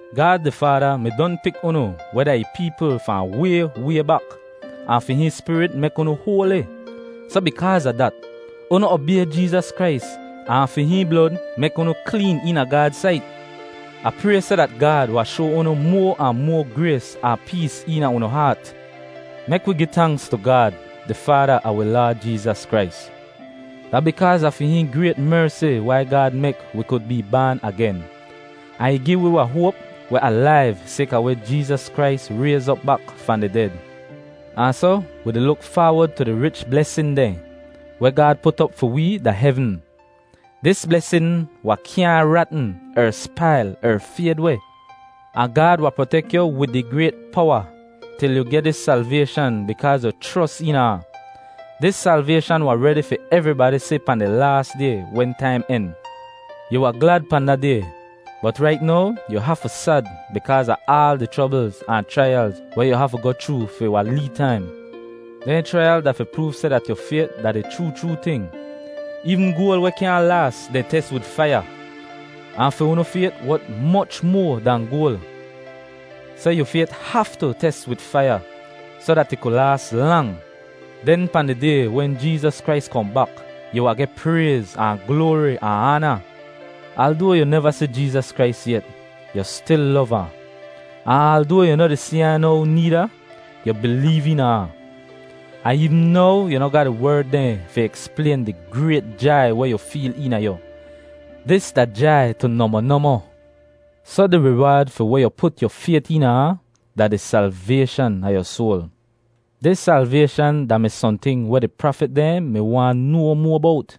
Gaad di Faada mi don pik unu weh da ih peepl fahn way, way bak, ahn fi hihn Spirit mek unu hoali. Soh, bikaaz a dat, unu obay Jeezas Krais ahn fi hihn blod mek unu kleen eena Gaad sait. Ah pray seh dat Gaad wahn shoa unu moa ahn moa grays ahn pees eena unu haat. Mek wi gi tanks tu Gaad, di Faada a wi Laad Jeezas Krais! Da bikaaz a fi hihn grayt mersi wai Gaad mek wi kud bee baan agen ahn ih gi wi wahn hoap weh alaiv sayka weh Jeezas Krais rayz op bak fahn di ded. Ahn soh wi di luk faawod tu di rich blesin dehn weh Gaad put op fi wee da hevn. Dis blesin wahn kyaahn ratn er spail er fayd weh. Ahn Gaad wahn protek yu wid ih grayt powa til yu geh dis salvayshan bikaaz yu chros eena ahn. Dis salvayshan wahn redi fi evribadi si pahn di laas Day wen taim en. Yu wahn glad pahn da Day, bot rait now yu hafu sad bikaaz a aal di chroblz ahn chraiyalz weh yu hafu goh chroo fi wahn lee taim. Dehn chraiyal da fi proov seh dat yu fayt da di chroo chroo ting. Eevn goal weh kyaahn laas, dehn tes wid faiya, ahn fi unu fayt wot moch moa dahn goal. Soh yu fayt haftu tes wid faiya soh dat ih ku laas lang. Den pahn di Day wen Jeezas Krais kohn bak, yu wahn geh prayz ahn gloari ahn aana. Aldoa yu neva si Jeezas Krais yet, yu stil lov ahn; ahn aldoa yu no di si ahn now needa, yu bileev eena ahn. Ahn eevn now yu noh ga di werd dehn fi eksplayn di grayt jai weh yu feel eena yu; dis da jai tu nohmoh nohmoh. Soh, di riwaad fi weh yu put yu fayt eena ahn, da di salvayshan a yu soal. Dis salvayshan da-mi sohnting weh di prafit dehn mi waahn noa moa bowt.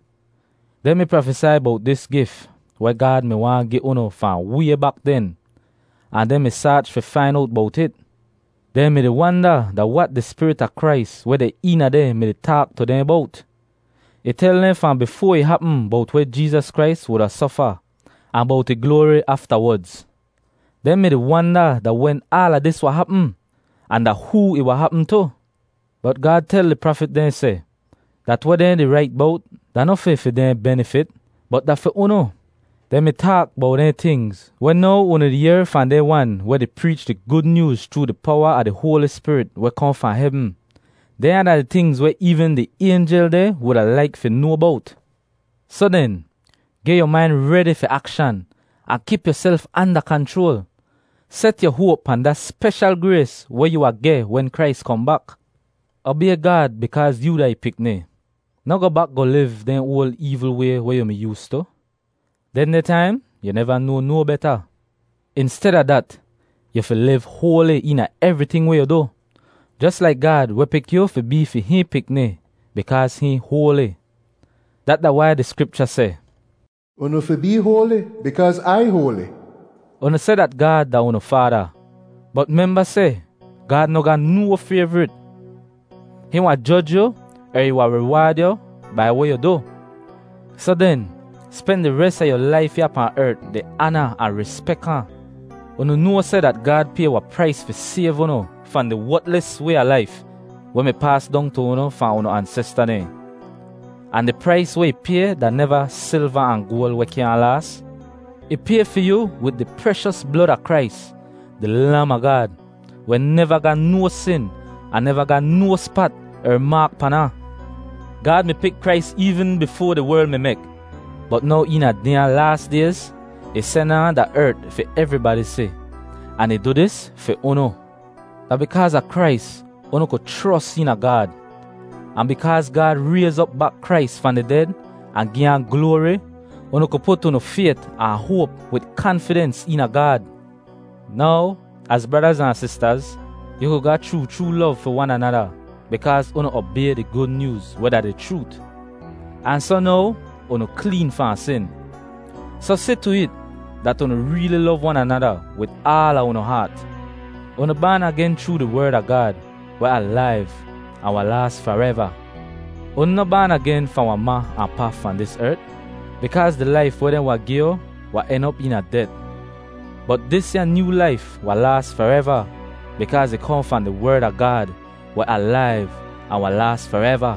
Dehn mi prafesai bowt dis gif weh Gaad mi waahn gi unu fahn way bak den ahn dehn mi saach fi fain owt bowt it. Dehn mi-di wanda da wat di Spirit a Krais weh deh eena dehn mi-di taak tu dehn bowt. Ih tel dehn fahn bifoa ih hapm bowt weh Krais wuda sofa ahn bowt ih gloari aftawodz. Dehn mi-di wanda da wen aala dis wahn hapm ahn da hoo ih wahn hapm tu. Bot Gaad tel di prafit dehn seh dat weh dehn di rait bowt da noh fi fi dehn benifit, bot da fi unu. Dehn mi taak bowt dehn tingz weh now unu di yehr fahn dehn wan weh di preech di Gud Nyooz chroo di powa a di Hoali Spirit weh kohn fahn hevn. Dehnya da tingz weh eevn di aynjel dehn wuda laik fi noa bowt. Soh den, geh yu main redi fi akshan ahn kip yuself anda kanchroal. Set yu hoap pahn da speshal grays weh yu wahn geh wen Krais kohn bak. Obay Gaad bikaaz yoo da ih pikni. Noh goh bak goh liv dehn oal eevl way weh yu mi yoostu. Dehndeh taim yu neva noa no beta. Insteda dat, yu fi liv hoali eena evriting weh yu du, jos laik Gaad weh pik yu fi bee fi hihn pikni, bikaaz hihn hoali. Dat da wai di Skripcha seh, “Unu fi bee hoali, bikaaz Ai hoali.” Unu seh dat Gaad da unu Faada, bot memba seh Gaad noh ga no fayvrit. Hihn wahn joj yu er ih wahn riwaad yu bai weh yu du. Soh den spen di res a yu laif ya pahn ert di aana ahn rispek ahn. Unu noa seh dat Gaad pay wahn prais fi sayv unu fahn di wotlis way a laif weh mi paas dong tu unu fahn unu ansesta dehn. Ahn di prais weh ih pay da neva silva ahn goal weh kyaahn laas. Ih pay fi yu wid di preshos blod a Krais, di Lam a Gaad weh neva ga no sin ahn neva ga no spat er maak pan ahn. Gaad mi pik Krais eevn bifoa di werl mi mek, bot now eena dehnya laas dayz, ih sen ahn da ert fi evribadi si. Ahn ih du dis fi unu. Da bikaaz a Krais unu ku chros eena Gaad. Ahn bikaaz Gaad rayz op bak Krais fahn di ded ahn gi ahn gloari, unu ku put unu fayt ahn hoap wid kanfidens eena Gaad. Now, az bradaz ahn sistaz, yu ku ga chroo chroo lov fi wan anada bikaaz unu obay di Gud Nyooz weh da di chroot, ahn soh now unu kleen fahn sin. Soh si tu it dat unu reeli lov wan anada wid aala unu haat. Unu baan agen chroo di Werd a Gaad weh alaiv ahn wahn laas fareva. Unu noh baan agen fahn wahn ma ahn pa fahn dis ert, bikaaz di laif weh dehn wahn gi yu wahn en op eena det. Bot disya nyoo laif wahn laas fareva bikaaz ih kohn fahn di Werd a Gaad weh alaiv ahn wahn laas fareva.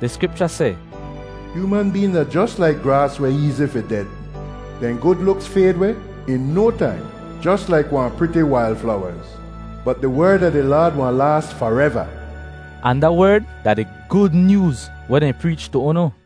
Di Skripcha seh, “Hyooman been da jos laik graas weh eezi fi ded; dehn gud luks fayd weh in no taim jos laik wahn priti wail flowaz. Bot di Werd a di Laad wahn laas fareva.” Ahn da werd da di Gud Nyooz weh dehn preech tu unu.